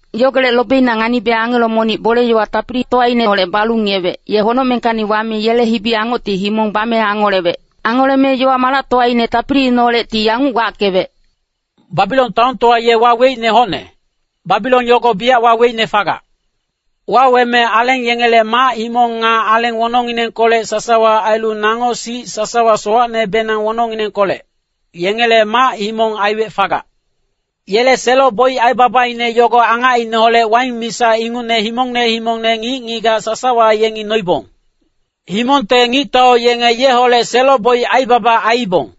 Yogolec lobeina nganibe angelo monic bole-yowa tapilitowaineholec balu ngiyewec, ye honocmengkacni wame yele hibi-angocti himong bame angolewec. Angoleme yowa-malactowaine tapiliineholecti yanguc wackewec, “Babilon taontowa ye waweicne hocne, Babilon yogo biyac waweicne fagac. Waweme aleng yengele mac-himong nga aleng wonongnginengkolec sasawa ailu nango sic sasawa sowacnebenang wonongnginengkolec, yengele mac-himong aiwec fagac. Yele selo-boic aibabaine yogo angacineholec waing misa ingucne himongne himongne ngic-ngigac sasawa yengi noibong. Himongte ngictau yenge yeholec selo-boic aibaba aiibong.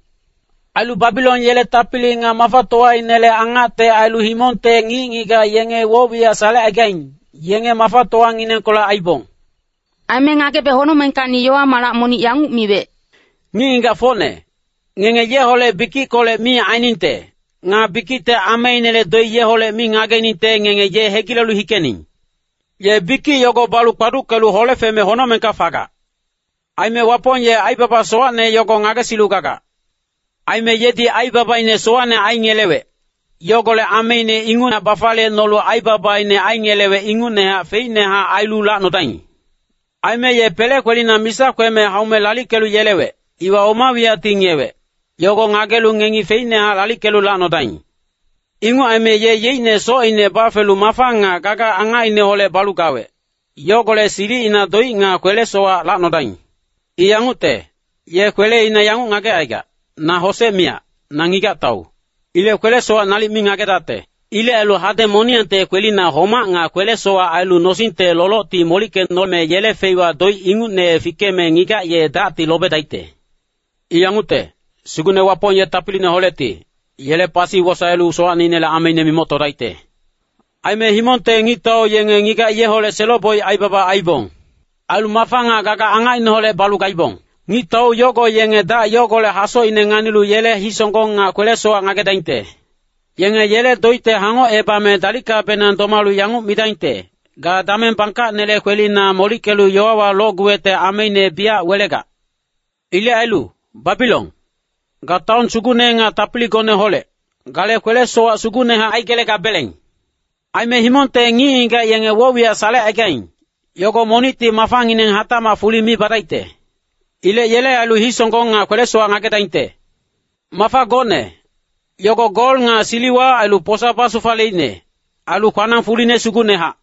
Ailu Babilon yele tapili nga mafatowainele angacte ailu himongte ngic-ngigac yenge woc-wiyac salecaigaing, yenge mafatowanginengkolec aiibong.” Aime ngagebe honocmengkacni yowa-malac monic yanguc miwec, “Ngic-ngigacfocne, ngenge yeholec bikickolec mi ainingte, nga bikicte ameinele doic yeholec mi ngageningte ngenge ye hegilelu hikening. Ye bikic yogo balu kpaduckelu hole feme honocmengka fegac. Aime Wapong ye aibaba sowacne yogo ngagesilu gagac. Aime yedi aibabaine sowacne aingelewec, yogolec ameine inguchac bafaliyecnolu aibabaine aingelewec ingucnehac feicnehac ailu lacnodaing. Aime ye pele kwelina misa kweme haume lalickelu yelewec, iwa oma wiyacti ngiyewec, yogo ngagelu ngengi feicnehac lalickecnolu lacnodaing. Inguc aime ye yeicne socine bafelu mafa nga gaga angacineholec balu gawec, yogolec silicina doic nga kwele-sowac lacnodaing. I yangucte, ye kweleina yanguc ngagecaigac, ‘Na hosec miyac, na ngigac-tau. Ilec kwele-sowac nalic mi ngagedacte.’ Ilec ailu hadeng moniyangte kwelina homac nga kwele-sowac ailu nosingte lolocti molickecnome yele feiwa doic ingucne fikeme ngigac ye dacti lobedaicte. I yangucte, Sugucne Wapong ye tapiliineholecti, yele pasi wosaelu sowacnele ameine mimoctodaicte.” “Aime himongte ngictau yenge ngigac yeholec selo-boic aibaba aiibong. Ailu mafa nga gaga angacineholec balu gaibong. Ngictau yogo yenge dac yogolec hasocine nganilu yele hisonggong nga kwele-sowac ngagedaingte. Yenge yele doicte hangocebame dalickabenang domalu yanguc midaingte, ‘Ga dameng bangkacnele kwelina molickelu yowawa locguwecte ameine biyac welegac. Ilec ailu, Babilon, ga taon sugucne nga tapiligoneholec, gale kwele-sowac sugucnehac aigelegabeleng.’ Aime himongte ngic-ngigac yenge woc-wiyac salecaigaing, yogo monicti mafangineng hatacmac fuli mi badaicte. Ilec yele ailu hisonggong nga kwele-sowac ngagedaingte. Mafa gocne, yogo gol nga siliwa ailu posa basufaleicne, ailu kwanang fuline sugucnehac.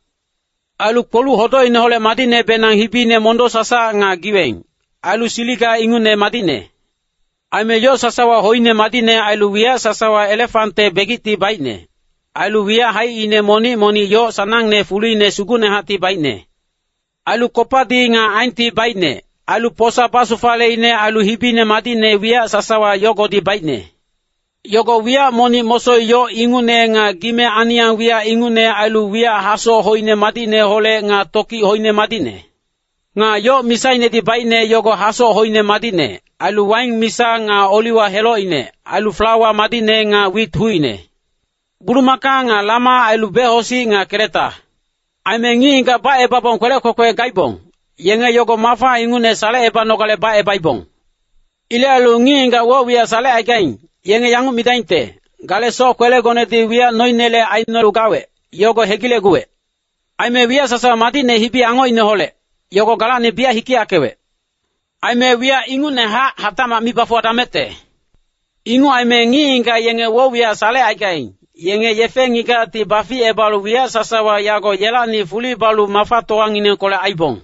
Ailu kpoluc hodocineholec madicnebenang hibine mondo-sasac nga giweng, ailu siliga ingucne madicne. Aime yoc sasawa hoine madicne ailu wiyac sasawa elefante begicti baicne, ailu wiyac haicine monic-monic yoc sanangne fuline sugucnehacti baicne. Ailu kopadi nga aenti baicne, ailu posa basufaleicne ailu hibine madicne wiyac sasawa yogodi baicne. Yogo wiyac monic mosoi yoc ingucne nga gime-aniyang wiyac ingucne ailu wiyac hasoc hoine madicneholec nga tokic hoine madicne. Nga yoc misainedi baicne yogo hasoc hoine madicne, ailu waing misa nga oliwa helocine, ailu flawa madicne nga wit hucine. Bulumaka nga lama ailu becosic nga keleta. Aime ngic-ngigac bacebabong kwelec kwekwe gaibong, yenge yogo mafa ingucne salecebanogale bacebaibong. “Ilec ailu ngic-ngigac woc-wiyac salecaigaing, yenge yanguc midaingte, ‘Gale soc-kwelegonedi wiyac noinele aicnolu gawec, yogo hegilecguwec. Aime wiyac sasawa madicne hibi-angocineholec, yogo galacni biyac hikeyackewec. Aime wiyac ingucnehac hatacmac mi bafuwadamecte.’ “Inguc aime ngic-ngigac yenge woc-wiyac salecaigaing, yenge yefe-ngigacti baficebalu wiyac sasawa yago yelacni fuli balu mafatowanginengkolec aiibong.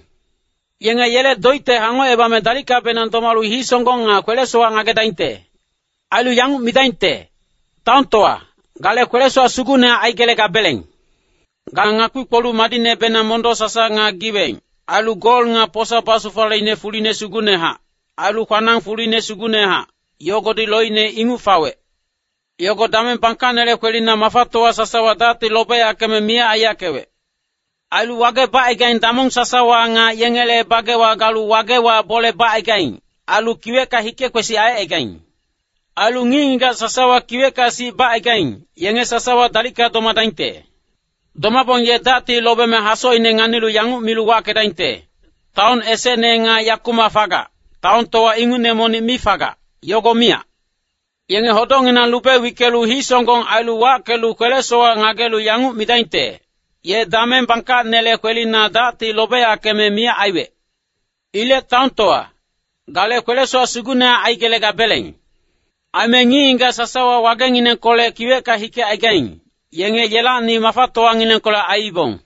Yenge yele doicte hangocebame dalickabenang domalu hisonggong nga kwele-sowac ngagedaingte. Ailu yanguc midaingte, ‘Taontowa, gale kwele-sowac sugucnehac aigelegabeleng. Ga ngakpi-kpoluc madicnebenang mondo-sasac nga giweng, ailu gol nga posa basufaleicne fuline sugucnehac, ailu kwanang fuline sugucnehac, yogodi loicne inguc fawec. Yogo dameng bangkacnele kwelina mafatowa sasawa dacti lobeyackeme miyac aiyackewec.’ Ailu wage bacaigaing damong sasawa nga yengele bagewa galu wagewa bole bacaigaing, ailu kiwecka hike-kwesic aicaigaing. Ailu ngic-ngigac sasawa kiwecka sic bacaigaing, yenge sasawa dalicka domadaingte. Domabong ye dacti lobeme hasocine nganilu yanguc milu wackedaingte, ‘Taon esecne nga yakumac fagac, taontowa ingucne monic mi fagac, yogo miyac.’ Yenge hodocnginang lube wickelu hisonggong ailu wackelu kwele-sowac ngagelu yanguc midaingte, ‘Ye dameng bangkacnele kwelina dacti lobeyackeme miyac aiwec. Ilec taontowa, gale kwele-sowac sugucnehac aigelegabeleng. Aime ngic-ngigac sasawa wagenginengkolec kiwecka hikecaigaing, yenge yelacni mafatowanginengkolec aiibong.’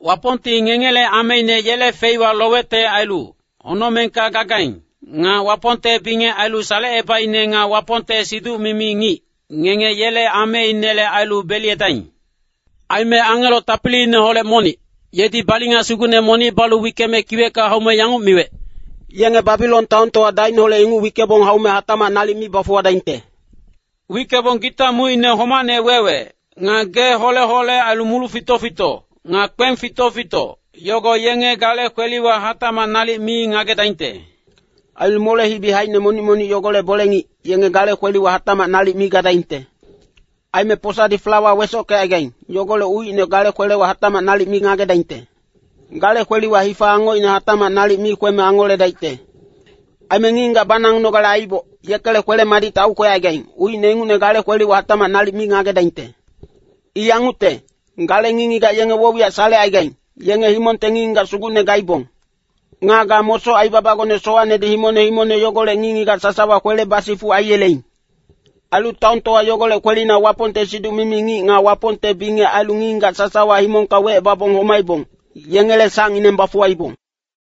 Wapongti ngengele ameine yele feiwa lowecte ailu, honocmengka gagaing, nga Wapongte bingec ailu salecebaicne nga Wapongte siduc-mimi ngic, ngenge yele ameinele ailu beliyedaing.” Aime angelo tapiliineholec monic, yedi balinga sugucne monic balu wickeme kiwecka haume yanguc miwec, “Yenge Babilon taontowa dacineholec inguc wickebong haume hatacmac nalic mi bafuwadaingte. Wickebong gita mucine homacne wewe, nga gee hole-hole ailu muluc fito-fito, nga kpeng fito-fito, yogo yenge gale kweliwa hatacmac nalic mi ngagedaingte. Ailu mole-hibi haicine monic-monic yogolec bole-ngic, yenge gale kweliwa hatacmac nalic mi gadaingte. Aime posadi flawa wesockecaigaing, yogolec ucine gale kweliwa hatacmac nalic mi ngagedaingte. Gale kweliwa hifa angocine hatacmac nalic mi kweme angoledaicte. Aime ngic-ngigac banagunogale aiboc, yekele kwele-madicte aukwecaigaing, ucine ingucne gale kweliwa hatacmac nalic mi ngagedaingte. I yangucte, gale ngic-ngigac yenge woc-wiyac salecaigaing, yenge himongte ngic-ngigac sugucne gaibong. Nga ga mosoc aibabagone sowacnedi himongne himongne yogolec ngic-ngigac sasawa kwele basifuc aiyeleing. Ailu taontowa yogolec kwelina Wapongte siduc-mimi ngic nga Wapongte bingec ailu ngic-ngigac sasawa himongka wecebabong homaibong, yengele sacngineng bafuwaibong.”